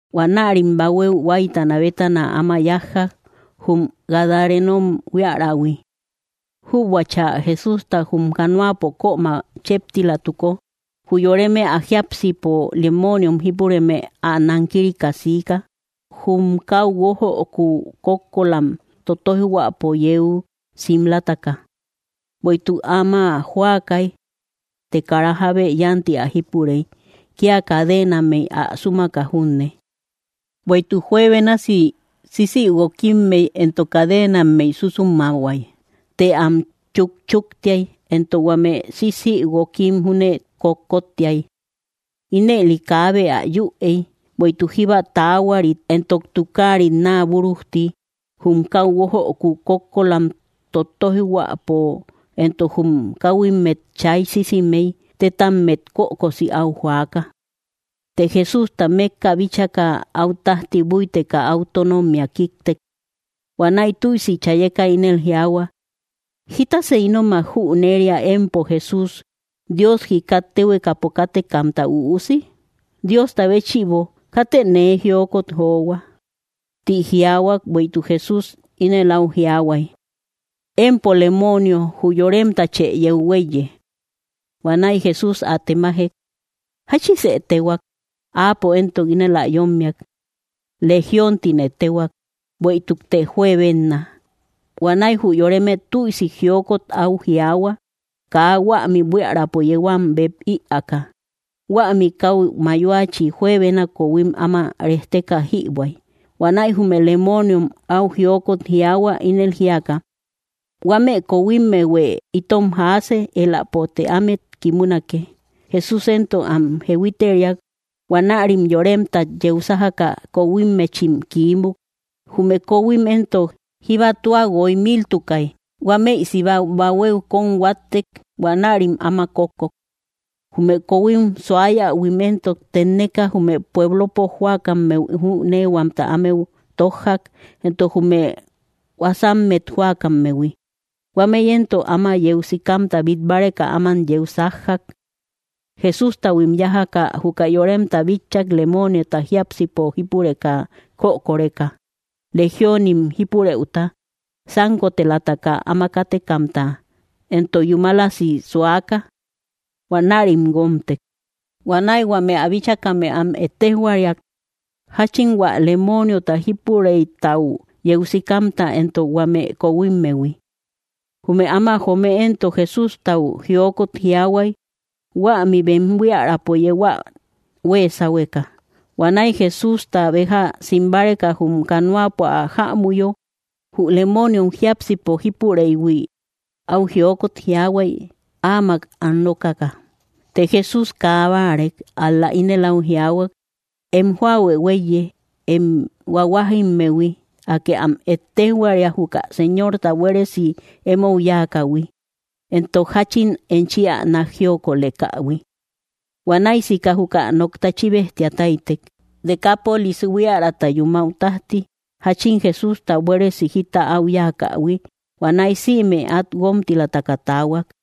Huanärim bahuéu huáytana bétana áma yájjak, jum Gadarenom buíarähui. Jübuachä Jesústa jum canoapo kömä chéptilatuko, jü yoreme ä jiápsipo lemooniom jípureme ä nankirika siika, jum kau guójöku kókkolam totoijhuäpo yeu simlataka; bueïtuk áma jóakay. Të kara jábe yánti ä jípurey, kia cadenammey ä súmaka junne. Bueïtuk juebénasi sisïguokimmey entok cadenammey súsumahuay, të am chukchuktiay, éntok huame sisïguookim júne kotkóttiay. Ínëli kaabe ä yüey. Bueïtuk jíba taahuarit entok tukaarit naa búrujti jum kau guójöku kókkolam totoijhuäpo entok jum káhuimmet chay sisimey, tétammet kökosi áu joaka. Të Jesústa mékka bíchaka, áu tájti búiteka áu tónommia kíktek. Huanäi tüisi chayeka ínel jiaahua: —¿Jítasë ínomak jüneria, empo Jesús, Dios jíkat téhuekapo kátekamta Üusi? Diosta béchïbo, katë nee jiokot johua. Tí jiaahuak bueïtuk Jesús ínel áu jiaahuay: —Empo lemoonio, jü yoremtachë yeu huéiye. Huanäi Jesús ä temajek: —¿Jáchisë téhuaak? Áapo éntok ínel ä yommiak: —Legión tine téhuak, bueïtukte juebenna. Huanäi jü yoreme tüisi jiokot áu jiaahua kaa huämi buiärapo yeu am bep ïaaka. Huämi kau mayoachi juebena kohuim áma rejteka jïbuäy. Huanäi jume lemooniom áu jiokot jiaahua, ínel jíaka: —Huame kohuimmehuë itom jaase; éläpote ámet kimunake. Jesús éntok am jehuiteriak. Huanärim yoremtat yeu sájaka, kohuimmechim kiímuk. Jume kohuim éntok, jíbatua guoy míltukay. Huámëi siba bahuéu kóm huáttek; huanärim áma kókkok. Jume kohuim suayähuim éntok tenneka, jume pueblopo jóakammeu jüneehuamta ámeu tójjak, entok jume huasammet jóakammehui. Huámëi éntok áma yeu sikamta bit báreka áman yeu sájjak. Jesústahuim yájaka juka yoremta bitchak lemooniota jiápsipo jípureka kökoreka, Legiónim jípurëuta, sánkotelataka áma kátekamta, entok yúmalasi suaka; huanärim guómtek. Huanäi huame ä bíchakame am ettéjhuariak jáchin hua lemooniota jípurëitau yeu sikamta, entok huame kohuimmehui. Jume áma joome éntok Jesústau jiokot jiaahuay huämi bem buíärapo yeu ä huée sáhueka. Huanäi Jesústa béja sim báreka jum canoapo ä jämuyo, jü lemooniom jiápsipo jípureïhui áu jiokot jiaahuay áamak an rókaka. Të Jesús kaa báarek, ál‑la ínel áu jiaahuak: —Em jóahuë huéiye, em huahuajimmehui. Akë am ettéjhuaria juka Señorta buéresi emou yáakähui, entok jáchin enchi ä nák jiokolekähui. Huanäi sika juka nokta chíbejtia táytek. Decapolis buíärata yúmau tájti, jáchin Jesústa buéresi jita áu yáakähui. Huanäi sïme át guómtilamtaka taahuak.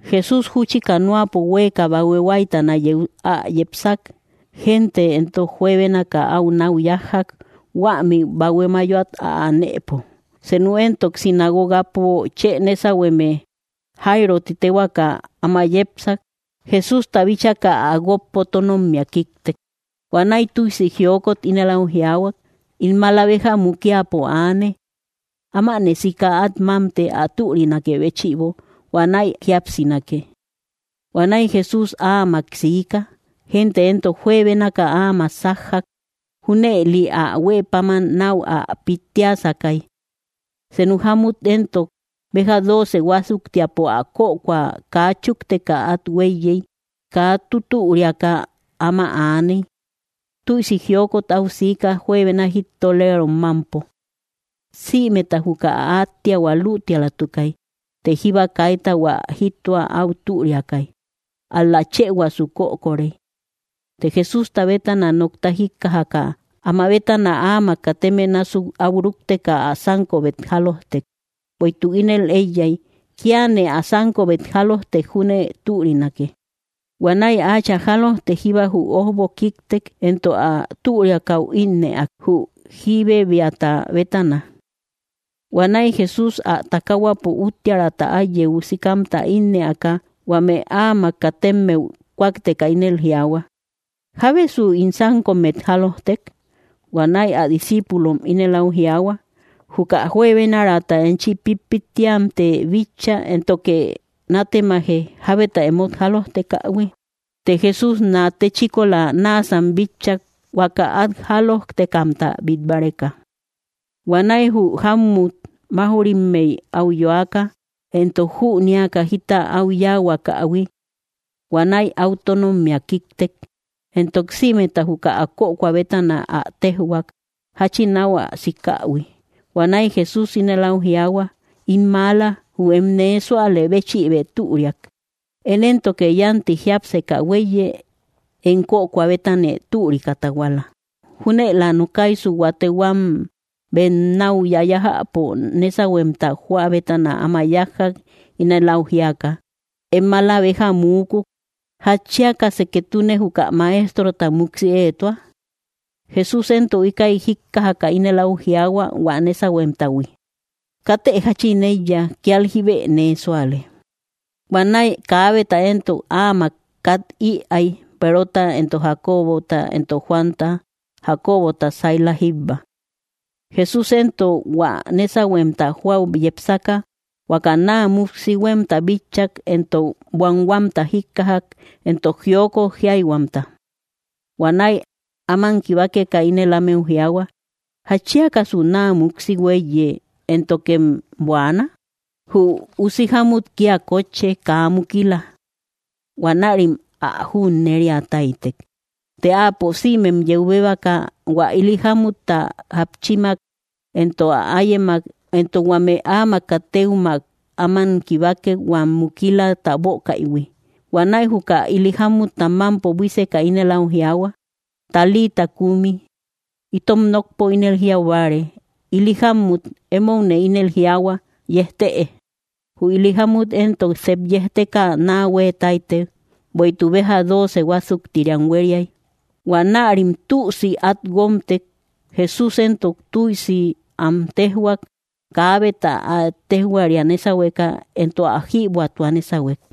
Jesús júchi canoapo huéeka bahue huáytana yeu ä yepsak. Gente éntok juebénaka áu nau yájjak, huämi bahue mayoat ä anëpo. Senu éntok sinagogapo chë nésahueme, Jáirö ti téhuakä, áma yepsak. Jesústa bíchaka ä guókpo tónommia kíktek. Huanäi tüisi jiokot ínel áu jiaahuak: —In maala béja mukiapo aane; ámanë sika át mámte, ä türinakë béchïbo, huanäi jíapsinake. Huanäi Jesús áamak siika; gente éntok juebénaka áamak sájjak. Júnëli ä huë páman nau ä pittiasakay. Senu jámmut éntok béja dooce huásuktiapo ä kökoa kaa chúkteka át huéiyey, kaa tutüriaka áma aaney. Tüisi jiokot au siika, juebena jittoleerom mámpo; sïmeta juka ä átteahua luutialatukay. Të jíba kaita hua jittoa áu türiakay, ál‑la chëhuasu kökorey. Të Jesústa bétana nokta jíkkajaka, amá bétana áamak kateme násuk áu rúkteka ä sánkobet jálojtek, bueïtuk ínel éiyay: “Kiane ä sánkobet jálojtek júne türinake.” Huanäi áachä jálojtek jíba jü ójbo kíktek. Entok ä türiakäu ínnëak, jü jíbebeata bétana. Huanäi Jesús ä takaahuapo úttiärata át yeu sikamta ïinnëaka, huame áamak katemmeu kúakteka ínel jiaahua: —¿Jábesu ín sánkommet jálojtek? Huanäi ä discíipulom ínel áu jiaahua: —Juka juebenaraata enchi pítpittiamtë bitcha, éntoke nátemaje, “¿Jábeta émot jálojtekähui?” Të Jesús nate chíkola náasam bitchak huaka at jálojtekamta bit báreka. Huanäi jü jámmut máujrimmey, áu yoaka, entok jünéaka jita áu yáahuakähui. Huanäi áu tónommia kíktek, entok sïmeta juka ä kökoa bétana ä téjhuak, jáchin áu ä sikähui. Huanäi Jesús ínel au jiaahua: —In maala, jü em nee súalë béchïbë türiak. Én éntoke yanti jiápseka huéiye, em kökoa bétanë türikä tahuala. Júnëlä nokaisu, huate huam bem nau yayájäpo nésauhuemta joa bétana áma yájjak ínel au jiaka: —Em mala béja muúkuk. ¿Jatchíakasë ketune juka Maestrota muksi éetua? Jesús éntok íkäi jíkkajakä ínel au jiaahua hua nésauhuemtahui: —Katë jachin eiya; kial jíbe nee súale. Huanäi kaabeta éntok áamak kat ïai Perota, éntok Jacobota, éntok Juanta Jacobota saíla jíbba. Jesús éntok hua nésauhuemta joau yepsaka, huaka naa muksi huemta bitchak, éntok buanhuamta jíkkajak, éntok jiokot jiáihuamta. Huanäi áman kibákeka ínel ámeu jiaahua: —¿Jatchíakasu naa muksi huéiye, éntokem buaana? Jü usi jámmut kia kotche, kaa mukila. Huanärim ä junnériataitek. Të Áapo sïmem yeu béebaka, hua ili jámutta jápchimak, éntok ä áyemak, éntok huame áamak katëummak áman kibákek huam múkilata bökaïhui. Huanäi juka ili jámutta mampo buíseka ínel au jiaahua: —Talita kumi —itom nokpo ínel jiaubáare: Ili jámmut, émoune ínel jiaahua, yejtë. Jü ili jámmut éntok sep yejteka naa hueetáitek, bueïtuk béja dóoce huásuktiriam huériai. Huanärim tüsi at guómtek. Jesús éntok tüisi am téjhuak kaabeta ä ettéjhuaria nésauhueka, éntok ä jïbuätua nésauhuek.